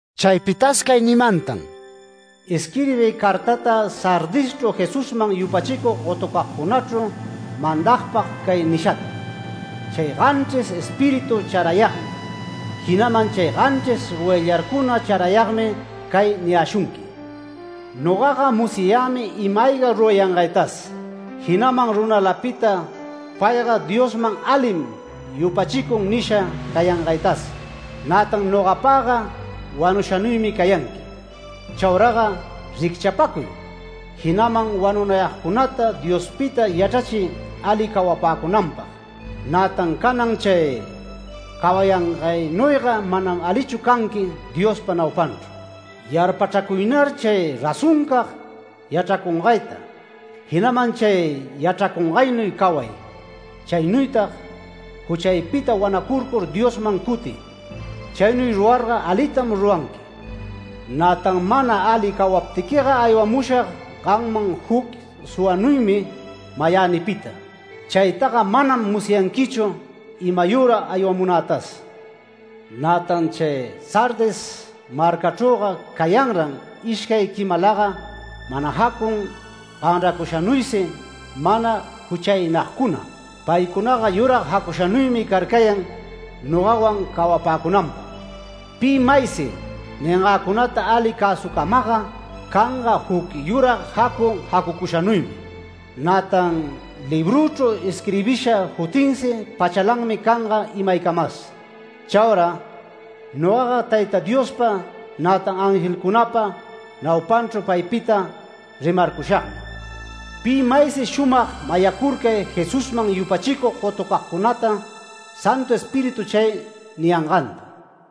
Chaypitas cay nimantan: “Isquirbiy cartata Sardischru Jesusman yupachicug gotucagcunachru mandagpag cay nishata: —‘Chay ganchris Espíritu charayagmi, jinaman chay ganchris goyllarcuna chrarayagmi cay niyäshunqui: Nogaga musyayämi ima-ayga rurayangaytas, jinaman runalapita “Payga Diosman alim yupachicun” nisha cayangaytas, nätan nogapagga wanushanuymi cayanqui. Chauraga ricchapacuy, jinaman wanunayagcunata Diospita yachrachiy ali cawapäcunanpag. Nätan canan chay cawayangaynuyga manam alichu canqui Diospa naupanchru. Yarpachracuynar chay razoncag yachracungayta, jinaman chay yachracungaynuy caway. Chaynuytag juchaypita wanacurcur Diosman cutiy. Chaynuy rurarga alitam ruranqui. Nätan mana ali cawaptiquiga aywamushag gamman juc suwanuymi mayänipita. Chaytaga manam musyanquichu imayüra aywamunätas. Nätan chay Sardis marcachrüga cayanran ishcay quimalaga mana jacun ganracushanuysi mana juchaynagcuna. Paycunaga yurag jacushanuymi carcayan nogawan cawapäcunanpag. Pi maysi ningäcunata ali cäsucamagga canga juc yurag jacu jacucushanuymi. Nätan librüchru isquirbisha jutinsi pachalanmi canga imaycamas. Chaura nogaga Tayta Diospa, nätan angelcunapa naupanchru paypita rimarcushagmi. Pi maysi shumag mayacurcay Jesusman yupachicug gotucagcunata, Santu Espíritu chay niyanganta’ ”.—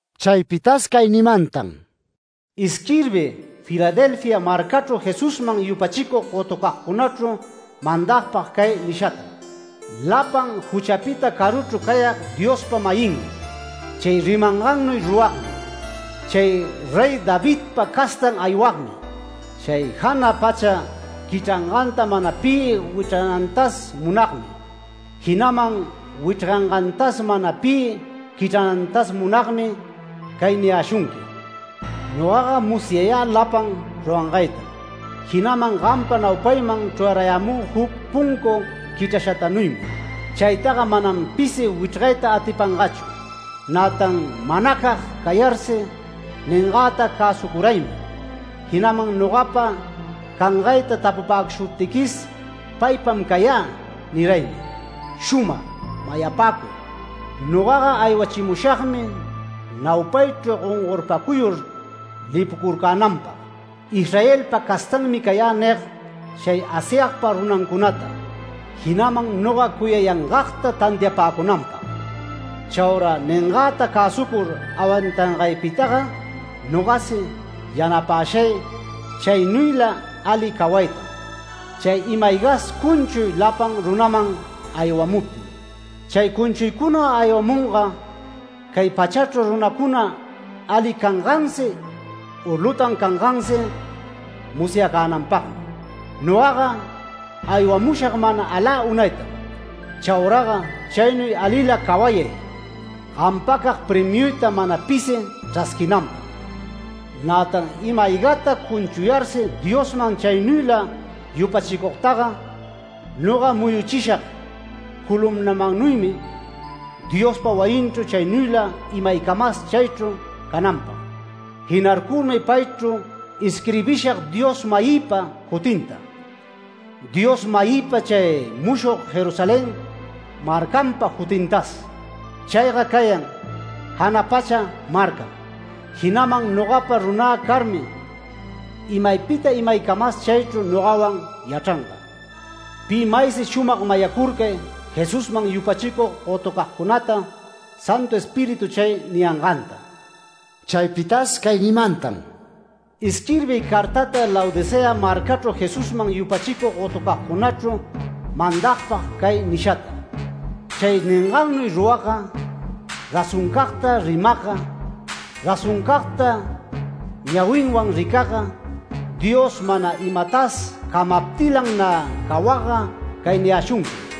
Chaypitas cay nimantan: “Isquirbiy Filadelfia marcachru Jesusman yupachicug gotucagcunachru mandagpag cay nishata: —‘Lapan juchapita caruchru cayag Diospa-mayinmi, chay rimangannuy ruragmi, chay Rey Davidpa castan aywagmi, chay jana pacha quichranganta mana pi wichrganantas munagmi, jinaman wichrgangantas mana pi quichranantas munagmi cay niyäshunqui: Nogaga musyayä lapan rurayangaytam. Jinaman gampa naupayman chrurayämü juc puncu quichrashatanuymi. Chaytaga manam pisi wichrgayta atipangachu. Nätan manacag cayarsi ningäta cäsucuraymi, jinaman nogapa cangayta tapupäcushuptiquis, “Paypam cayä” niraymi. Shumag mayapäcuy: Nogaga aywachimushagmi naupaychru gongorpacuyur lipucurcänanpag, “Israelpa castanmi cayä” nig chay Asyagpa runancunata, jinaman noga cuyayangagta tantiapäcunanpag. Chaura ningäta cäsucur awantangaypitaga nogasi yanapäshay chaynuyla ali cawaytam, chay ima-aygas cunchuy lapan runaman aywamuptin. Chay cunchuycuna aywamunga cay pachachru runacuna ali cangansi u lutan cangansi musyacänanpagmi. Nogaga aywamushag manas alä unaytam. Chauraga chaynuy alila cawayay, gampacag premiuyta mana pisi chrasquinanpag. Nätan ima-aygata cunchuyarsi Diosman chaynuyla yupachicugtaga, noga muyuchishag columnamannuymi Diospa wayinchru, chaynuyla imaycamas chaychru cananpag. Jinarcurmi paychru isquirbishag Dios-mayïpa jutinta, Dios-mayïpa chay mushog Jerusalén marcanpa jutintas. Chayga cayan jana pacha marcam, jinaman nogapa runä carmi imaypita imaycamas chaychru nogawan yachranga. Pi maysi shumag mayacurcay Jesusman yupachicug gotucagcunata, Santu Espíritu chay niyanganta’ ”.— Chaypitas cay nimantan: “Isquirbiy cartata Laodicea marcachru Jesusman yupachicug gotucagcunachru mandagpag cay nishata: —‘Chay ningannuy ruragga, razoncagta rimagga, razoncagta ñawinwan ricagga, Dios mana imatas camaptilan nä cawagga cay niyäshunquim: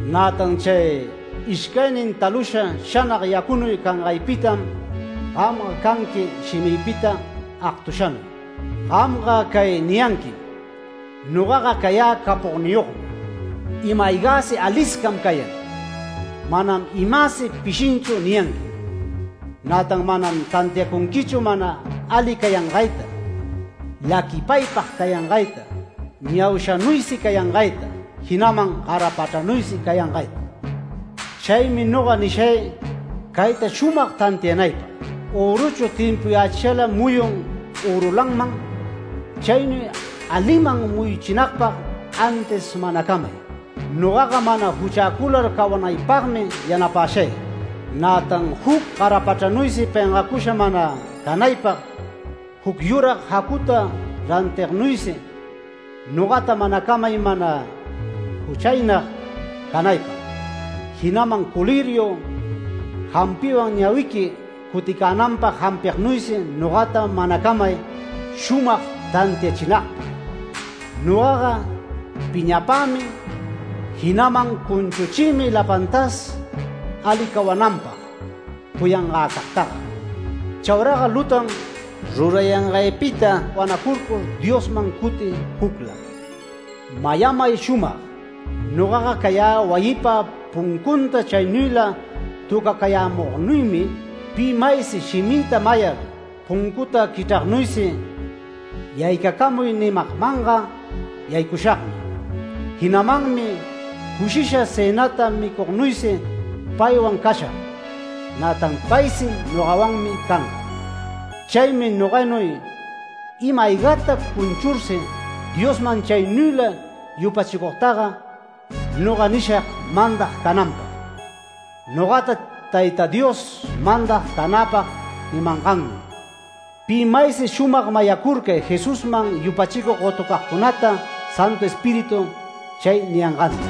Nätan chay ishcaynin talusha shanag yacunuy cangaypitam gamga canqui shimïpita agtushanuy. Gamga cay niyanquim: “Nogaga cayä capogniyogmi, ima-aygäsi aliscam cayan, manam imäsi pishinchu” niyanquim. Nätan manam tantiacunquichu mana ali cayangayta, laquipaypag cayangayta, ñaushanuysi cayangayta, jinaman garapachranuysi cayangayta. Chaymi noga nishay cayta shumag tantianaypag: Öruchu timpuyächishala muyun örulanman. Chaynuy aliman muyuchinagpag antis manacamay, nogaga mana juchäcular cawanaypagmi yanapäshay. Nätan juc garapachranuysi pengacusha mana canaypag juc yurag jacuta rantignuysi, nogata manacamay mana juchaynag canaypag. Jinaman “coliriu” jampiwan ñawiqui cuticänanpag jampignuysi nogata manacamay shumag tantiachinagpag. Nogaga piñapämi, jinaman cunchuchïmi lapantas ali cawananpag cuyangäcagtaga. Chauraga lutan rurayangaypita wanacurcur Diosman cutiy jucla. Mayamay shumag: Nogaga cayä wayipa puncunta chaynuyla töcacayämugnuymi. Pi maysi shimïta mayar puncuta quichragnuysi “Yaycacamuy” nimagmanga yaycushagmi. Jinamanmi cushisha cënata micugnuysi paywan cashag, nätan paysi nogawanmi canga. Chaymi noganuy ima-aygata cunchursi Diosman chaynuyla yupachicugtaga noga nishag mandag cananpag, nogata Tayta Dios mandag canäpag nimangannuy. Pi maysi shumag mayacurcay Jesusman yupachicug gotucagcunata Santu Espíritu chay niyanganta’ ”.—